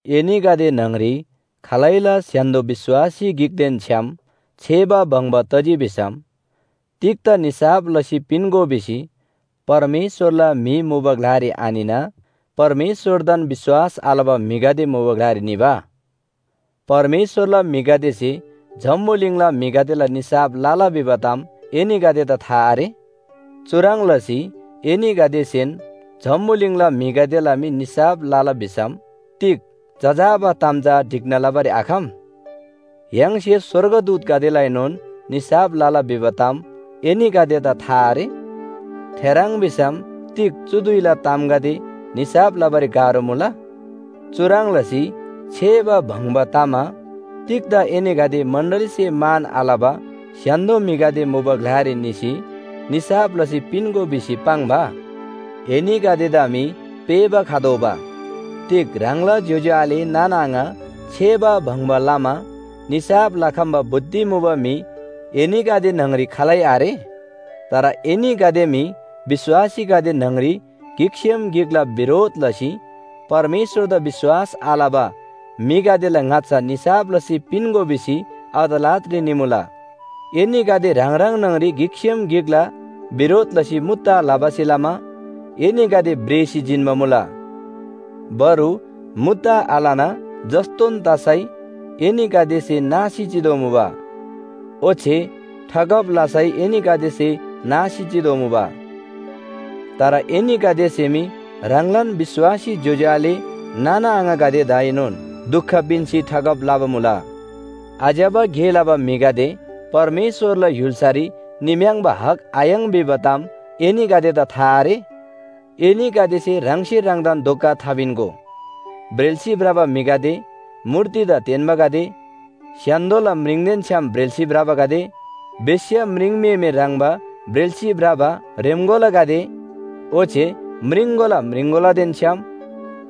एनीगदे न्‍हङरी खालैला स्‍य्‍हान्‍दो विश्‍वासी गिकदेन छ्‌याम छेबा बङ्बा तजी भिसम तिग्‍दा निसाफ लसी पिन्‍गो भिसी परमेश्‍वरला म्‍हि मुबा ग्‍लारी आनिना परमेश्‍वरदान विश्‍वास आलबा म्‍हिगदे मुबा ग्‍लारी निबा? परमेश्‍वरला म्‍हिगदेसे जम्‍बुलिङला म्‍हिगदेला निसाफ लला भिबा ताम एनीगदेदा था आरे? चुह्रङ् लसी एनीगदेसेन जम्‍बुलिङला म्‍हिगदेला मी निसाफ लला भिसम तिग जजाबा ताम चा ढिक्‍ना लबारी आखम? य्‍हाङसे स्‍वर्गदूतगदेलाएनोन निसाफ लला भिबा ताम एनीगदेदा था आरे? थेह्रङ् भिसम तिग चु धुइला तामगदे निसाफ लबारी गाह्रो मुला? चुह्रङ् लसी छेबा बङ्बा तमा तिग्‍दा एनीगदे मण्‍डलीसे मान आलबा स्‍य्‍हान्‍दो म्‍हिगदे मुबा ग्‍लारी निसी निसाफ लसी पिन्‍गो भिसी पाङ्बा? एनीगदेदा मी पेःबा खतोःबा। तिग ह्राङला ज्‍योज्‍यो आले नाना आङा छेबा बङ्बा लमा निसाफ लखम्‍बा बुद्धि मुबा म्‍हि एनीगदे न्‍हङरी खालै आरे? तर एनीगदे मी विश्‍वासीगदे न्‍हङरी गिकसेम गिकला बिरोध लसी परमेश्‍वरदा विश्‍वास आलबा म्‍हिगदेला ङाच्‍छा निसाफ लसी पिन्‍गो भिसी अदालतरी निमुला। एनीगदे ह्राङ ह्राङ न्‍हङरी गिकसेम गिकला बिरोध लसी मुद्दा लबासे लमा एनीगदे भ्रेःसी जिन्‍बा मुला। बरु मुद्दा आलना जस्‍तोन तसै एनीगदेसे नासी चितोःमुबा। ओच्‍छे ठगब लसै एनीगदेसे नासी चितोःमुबा। तर एनीगदेसे मी ह्राङलान विश्‍वासी ज्‍योज्‍यो आले नाना आङागदेदाएनोन दुख पिन्‍सी ठगब लबा मुला। आज्‍यबा गे लबा म्‍हिगदे परमेश्‍वरला य्‍हुल्‍सारी निम्‍याङ्‌बा हक आयाङ् भिबा ताम एनीगदेदा था आरे? एनीगदेसे ह्राङसे ह्राङदान धोका थापिन्‍गो। ब्रेल्‍सी भ्रबा म्‍हिगदे, मूर्तिदा तेन्‍बागदे, स्‍य्‍हान्‍दोला म्रिङदेन छ्‌याम ब्रेल्‍सी भ्रबागदे, बेश्‍या म्रिङम्‍हेमे ह्रङ्‌बा ब्रेल्‍सी भ्रबा ह्रेम्‍कोलागदे ओच्‍छे म्रिङकोला म्रिङकोलादेन छ्‌याम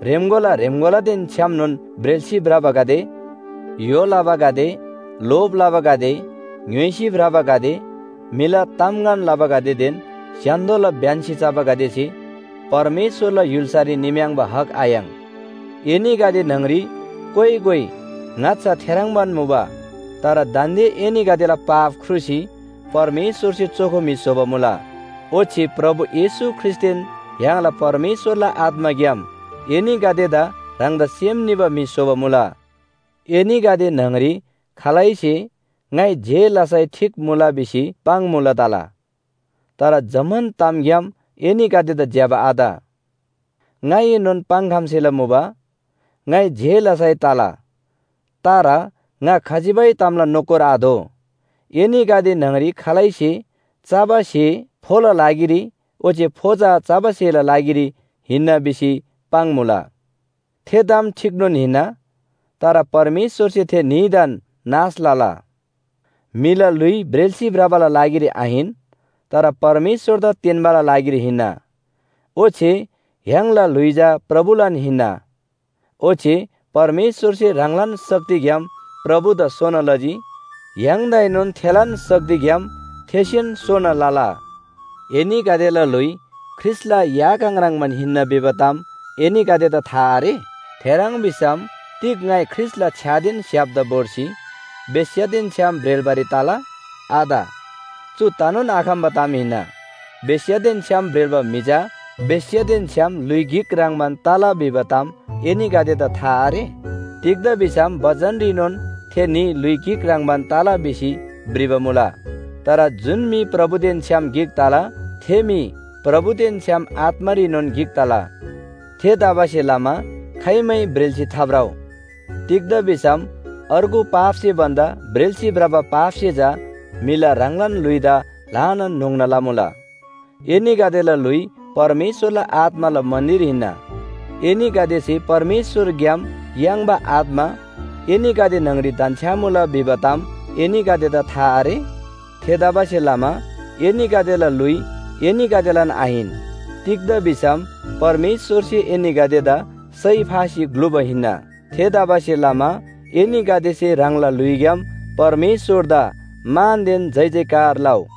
ह्रेम्‍कोला ह्रेम्‍कोलादेन छ्‌यामनोन ब्रेल्‍सी भ्रबागदे, य्‍हो लबागदे, लोभ लबागदे, ङ्‌य्‍होइसी भ्रबागदे, म्‍हिला तामगन लबागदेदेन स्‍य्‍हान्‍दोला ब्‍यन्‍सी चबागदेसे परमेश्‍वरला य्‍हुल्‍सारी निम्‍याङ्‌बा हक आयाङ्। एनीगदे न्‍हङरी कोइ कोइ ङाच्‍छा थेह्रङ्बान मुबा। तर दान्‍दे एनीगदेला पाप ख्रुसी परमेश्‍वरसे चोखो म्‍हि स्‍होबा मुला। ओच्‍छे प्रभु येशू ख्रीष्‍टदेन य्‍हाङला परमेश्‍वरला आत्‍माग्‍याम एनीगदेदा ह्राङदा सेम निबा म्‍हि स्‍होबा मुला। एनीगदे न्‍हङरी खालैसे “ङाइ जे लसै ठीक मुला” भिसी पाङ्‌मुला तला, तर जम्‍मान तामग्‍याम एनीगदेदा ज्‍यबा आत। ङाइएनोन पाङ्‌खम्‍सेला मुबा, “ङाइ जे लसै तला,” तर ङा खजिबै तामला नोकर आदो। एनीगदे न्‍हङरी खालैसे “चबा स्‍हे फोला लागिरी ओच्‍छे फो चबा स्‍हेला लागिरी हिन्‍ना” भिसी पाङ्‌मुला। थे ताम ठीकनोन हिन्‍ना, तर परमेश्‍वरसे थे न्‍हीदान नाश लला। म्‍हिला ल्‍हुइ ब्रेल्‍सी भ्रबाला लागिरी आहिन, तर परमेश्‍वरदा तेन्‍बाला लागिरी हिन्‍ना, ओच्‍छे य्‍हाङला ल्‍हुइ चा प्रभुलान हिन्‍ना। ओच्‍छे परमेश्‍वरसे ह्राङलान शक्तिग्‍याम प्रभुदा सोना लजी, य्‍हाङदाएनोन थेलान शक्तिग्‍याम थेसेन सोना लला। एनीगदेला ल्‍हुइ ख्रीष्‍टला या काङ ह्रङ्‌बान हिन्‍ना भिबा ताम एनीगदेदा था आरे? थेह्रङ् भिसम तिग ङाइ ख्रीष्‍टला छ्‍यादेन स्‍‍य्‍हापदा भोर्सी बेश्‍यादेन छ्‌याम ब्रेल्‍बारी तला? आत, चु तनोन आखम्‍बा ताम हिन्‍ना! बेश्‍यादेन छ्‌याम ब्रेल्‍बा म्‍हि चा बेश्‍यादेन छ्‌याम ल्‍हुइ गिक ह्रङ्‌बान तला भिबा ताम एनीगदेदा था आरे? तिग्‍दा भिसम बचनरीनोन “थे न्‍ही ल्‍हुइ गिक ह्रङ्‌बान तला” भिसी भ्रिबा मुला। तर जुन म्‍हि प्रभुदेन छ्‌याम गिक तला, थे म्‍हि प्रभुदेन छ्‌याम आत्‍मारीनोन गिक तला। थेतबासेलमा खाइमै ब्रेल्‍सी थाभ्रउ। तिग्‍दा भिसम अर्गु पापसे भन्‍दा ब्रेल्‍सी भ्रबा पापसे चा म्‍हिला ह्राङलान ल्‍हुइदा ल्‍हानान न्‍होङ्ना लमुला। एनीगदेला ल्‍हुइ परमेश्‍वरला आत्‍माला मन्‍दिर हिन्‍ना। एनीगदेसे परमेश्‍वरग्‍याम याङ्बा आत्‍मा एनीगदे न्‍हङरी धन्‍छ्‌यामुला भिबा ताम एनीगदेदा था आरे? थेतबासेलमा एनीगदेला ल्‍हुइ एनीगदेलान आहिन, तिग्‍दा भिसम परमेश्‍वरसे एनीगदेदा सय फासी ग्‍लुबा हिन्‍ना। थेतबासेलमा एनीगदेसे ह्राङला ल्‍हुइग्‍याम परमेश्‍वरदा मानदेन जयजयकार लउ।